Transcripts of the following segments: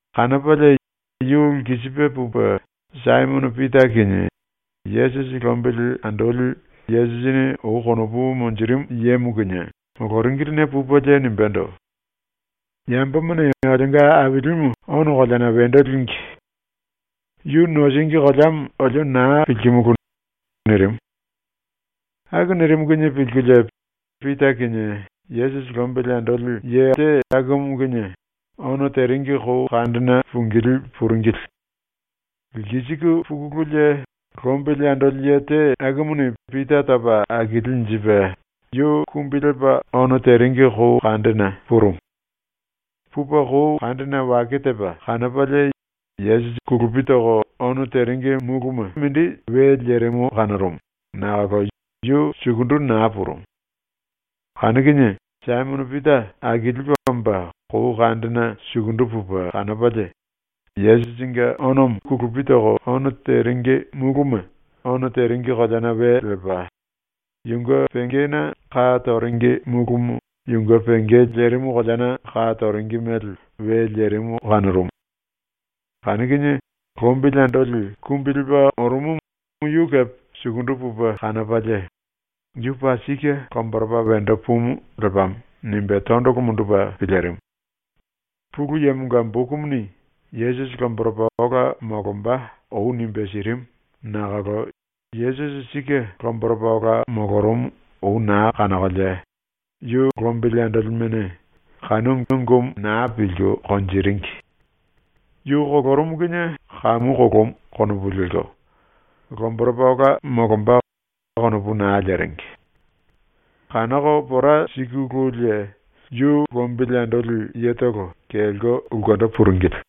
Kanopalie yu lkisipe pupe Saimono Pita kinie Yesusi lombili andoli Yesusini ou konopu monjirimu yemo kinie moloringiline pupelie nimbendo: “Yambomane olionga Ailimu ono koleana wendo língi. Yu nosíngi koleamo olio naa pilkimulu.” nirimu. Aku nirimu kinie pilkulie Pita kinie Yesusi lombili andoli ye akumu kinie ono teringi kou kandena pungilí puringili. Lkisiku pukululie, lombili andoli ye te akumuni Pita topa akilinjipe yu kumbi lepa ono teringi kou kandena purumu. Pupe kou kandena wake tepa kanopalie Yesusi kulupi toko ono teringi múluma we lerimu kanorumu, nakolo yu sukundu naa purumu. Kanu kinie Saimono Pita akilipe omba kou kandena sukundu pupe kanopalie, yu kulupi toko ono teringi múluma ono teringi koleana we lepa, yunge pengena ka toringi múlumu yunge penge lerimu koleana ka toringi mele we lerimu kanorumu. Kanu kinie lombili andoli kumbi lepa orumumu yu kepe sukundu pupe kanopalie, ‘Yu paa sike lomboropa wendo pumu lepamo.’ nimbe tondolo mundupe pilirimu. (Pulu Yemonga bokumuni Yesusi lomboropa ola molomba ou nimbe sirimu nakolo Yesusi sike lomboropa ola molorumu ou naa kanokolie yu lombili andolimene kanu ungumu naa pilku konjiringi. Yu kolorumu kinie ‘Kamu kolomu.’ konopu lelko, ‘Lomboropa ola molomba.’ konopu naa leringi.) Kanoko pora sikululie yu lombili andoli yetolo kelko ulkendo puringili.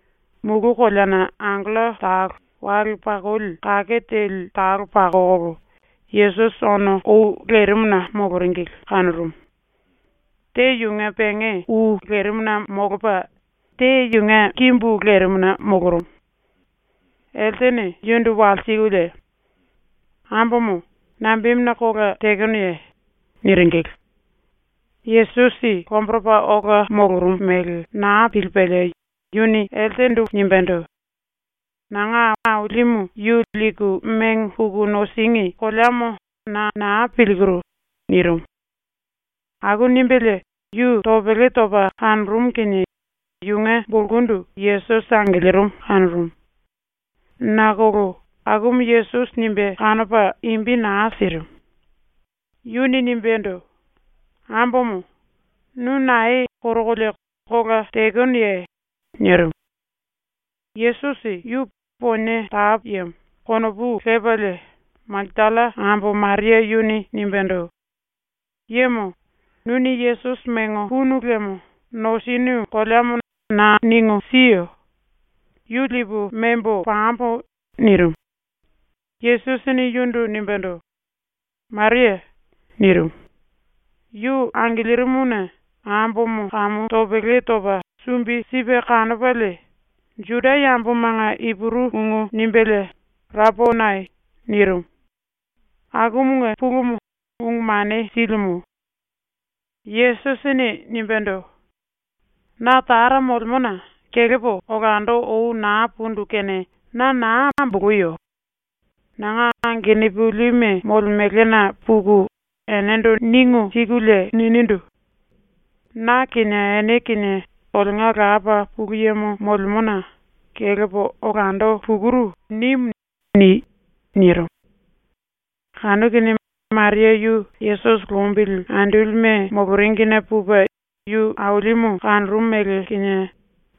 mulu koleana angello talo wale pakoli kake teli talo pakokolo Yesusi ono ou lerimuna moloringili kanorumu. Te yunge penge ou lerimuna molopa, te yunge kimbu lerimuna molorumu. Eltene yundu walsikulie: “Ambomo, nambemuna kola tekenoye?” niringili. Yesusi lomboropa ola molorumu mele naa pilipelie yuni nimbendo: “Nanga Ailimu yu liku mengo puku nosíngi koleamo na naa pilkiru.” nirimu. Aku nimbelie yu topele topa kanorumu kinie yunge bulkundu Yesusi angilirimu kanorumu. Nakolo akumu Yesusi nimbe kanopa imbi naa sirimu. Yuni nimbendo: “Ambomo, nu nae korokolie kola tekenoye?” nirimu. Yesusi yu ‘ponie tapu yemo’ konopu lepalie Makatalla ambo Maria yuni nimbendo: “Yemo, nuni Yesusi mengo punu liemo nosinu koleamo na ningu siyo. Yu lipu membo pambo.” nirimu. Yesusini yundu nimbendo: “Maria.” nirimu. Yu angilirimuna ambomo kamu topele topa sumbi sipe kanopalie Juda yambomanga Ipuru ungu nimbelie “Raponai.” nirimu. (Akumunge pulumu ‘Ungu Mane Silimu’.) Yesusini nimbendo: “Na Tara molemona kelepo olando ou naa pundu kene na naa amboloyo. Nanga angenupilime molemelena puku enendo ningu sikulie ninindu: “ “Na kinie ene kinie olionga Lapa Pulu Yemo molemona kelepo olando pukuru.” nimu.” ni.” nirimu. Kanu kinie Maria yu Yesusi lombili andolime moloringine pupe yu Ailimu kanorumu mele kinie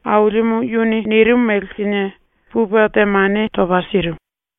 Ailimu yuni nirimu mele kinie pupe temane topa sirimu.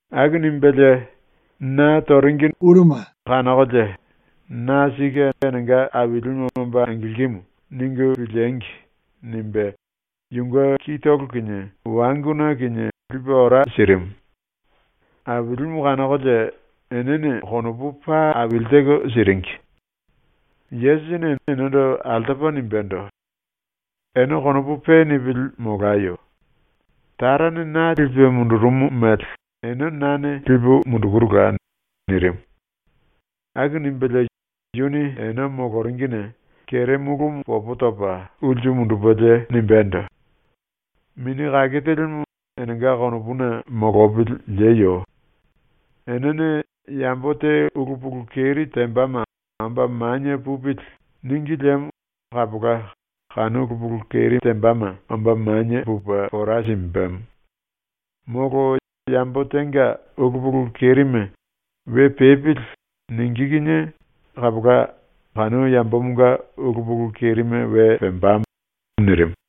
Aku nimbelie, ‘Na toringine kanokolie ‘Na sike enenga Ailimu omba angilkimu.’ ningu piliengi!’ nimbe yunge kitolo kinie wanguna kinie lipe ora sirimu. Ailimu kanokolie enene konopu paa aili teko siringi. Yesusini enendo altopa nimbendo: “Ene konopu pe nipili molayo. Tarane na lipe mundurumu mele ene nane lipu mundukurula.” nirimu. Aku nimbelie yuni ene moloringine kere múlumu popo topa ulsu mundupelie nimbendo: “Mini Kake Telimu enenga konopuna molopili lieyo. Enene yambo te ulu pulu keri tembama ‘Omba manie pupili.’ níngi liemo kapola kanu ulu pulu keri tembama omba manie pupe pora simbemo. Molo yambo tenga ulu pulu kerime ‘We pepili.’ ningí kinie kapola kanu yambomonga ulu pulu kerime we pembamo.” nirimu.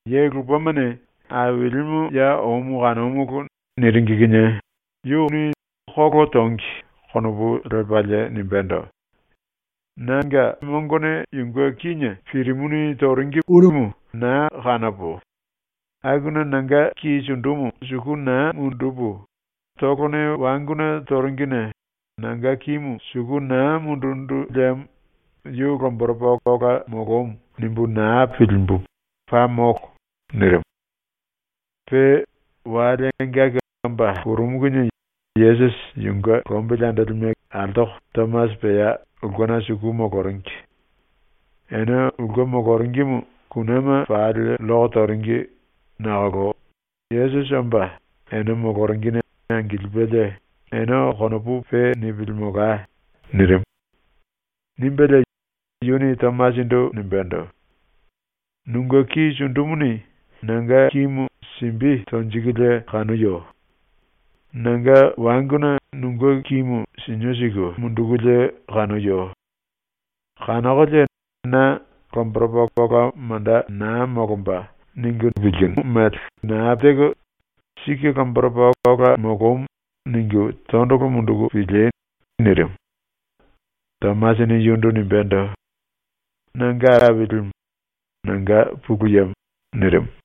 Ye lupemane “Ailimu ya omu kanomulu.” niringi kinie yu ‘Kolo tongi.’ konopu lepalie nimbendo: “Nane mongone yunge kíne pirimuni toringimu naa kanopo, akuna nanga ki sundumu suku naa mundupu, tolone wanguna toringine nanga kimu suku naa mundundu liemo ‘Yu lomboropa ola molomu.’ nimbu naa pilimbu, paa molo.” nirimu. Pe wale engaki omba purumu kinie Yesusi yunge lombili andolime altoko Tomasi pea ulkena suku moloringi. Ene ulke moloringimu kunema pali lloko toringi nakolo Yesusi omba ene moloringine angilipelie, “Ene konopu pe nipili molai.” nirimu. Nimbelie yuni Tomasindu nimbendo: “Nunge ki sundumuni nanga kimu simbi tonjikulie kanoyo. Nanga wanguna nunge kimu sinio siku mundukulie kanoyo. Kanokolie na ‘Lomboropa ola manda naa molomba.’ ningu naa pilku, ‘Sike lomboropa ola molomu.’ ningu tondolo munduku pili!” nirimu. Tomasini yundu nimbendo: “Nanga Ailimu, nanga Pulu Yemo.” nirimu.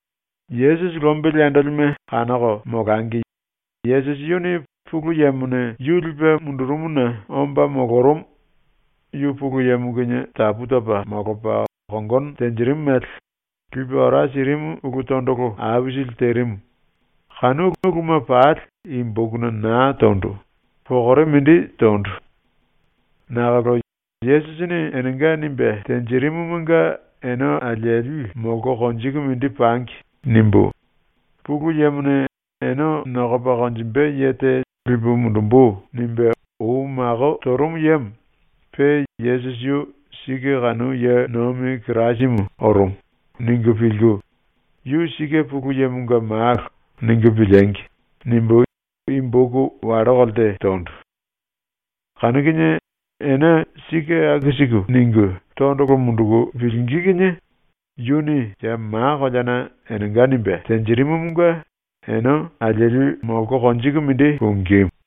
Yesusi lombili andolime kanoko molangi Yesusi yuni ⸤Pulu Yemone yu lipe mundurumuna omba molorumu, yu Pulu Yemo kinie tapu topa molopa kongono tenjirimu mele⸥ lipe ora sirimu ulu tondolo aisili terimu, kanu uluma pali i bokuna naa tondu, pokore mindi tondu. Nakolo ‘Yesusini enenga nimbe tenjirimumunge ene alieli molko konjiku mindi pangi.’ nimbu ‘ ‘Pulu Yemone “Ene nokopa konjimbe ye te lipu mundumbu.” nimbe ou mako torumu yemo, pe Yesusi yu sike kanu ye nomi Kirasimu orumu.’ ningu pilku, ‘Yu sike Pulu Yemonga Malo.’ ningu piliengi!’ nimbu i boku wallo kolte tondu. Kanu kinie ene sike aku siku ningu tondolo munduku pilingí kinie yuni ya ma koleana enenga nimbe tenjirimumunge ene alieli molko konjiku mindi pungímu.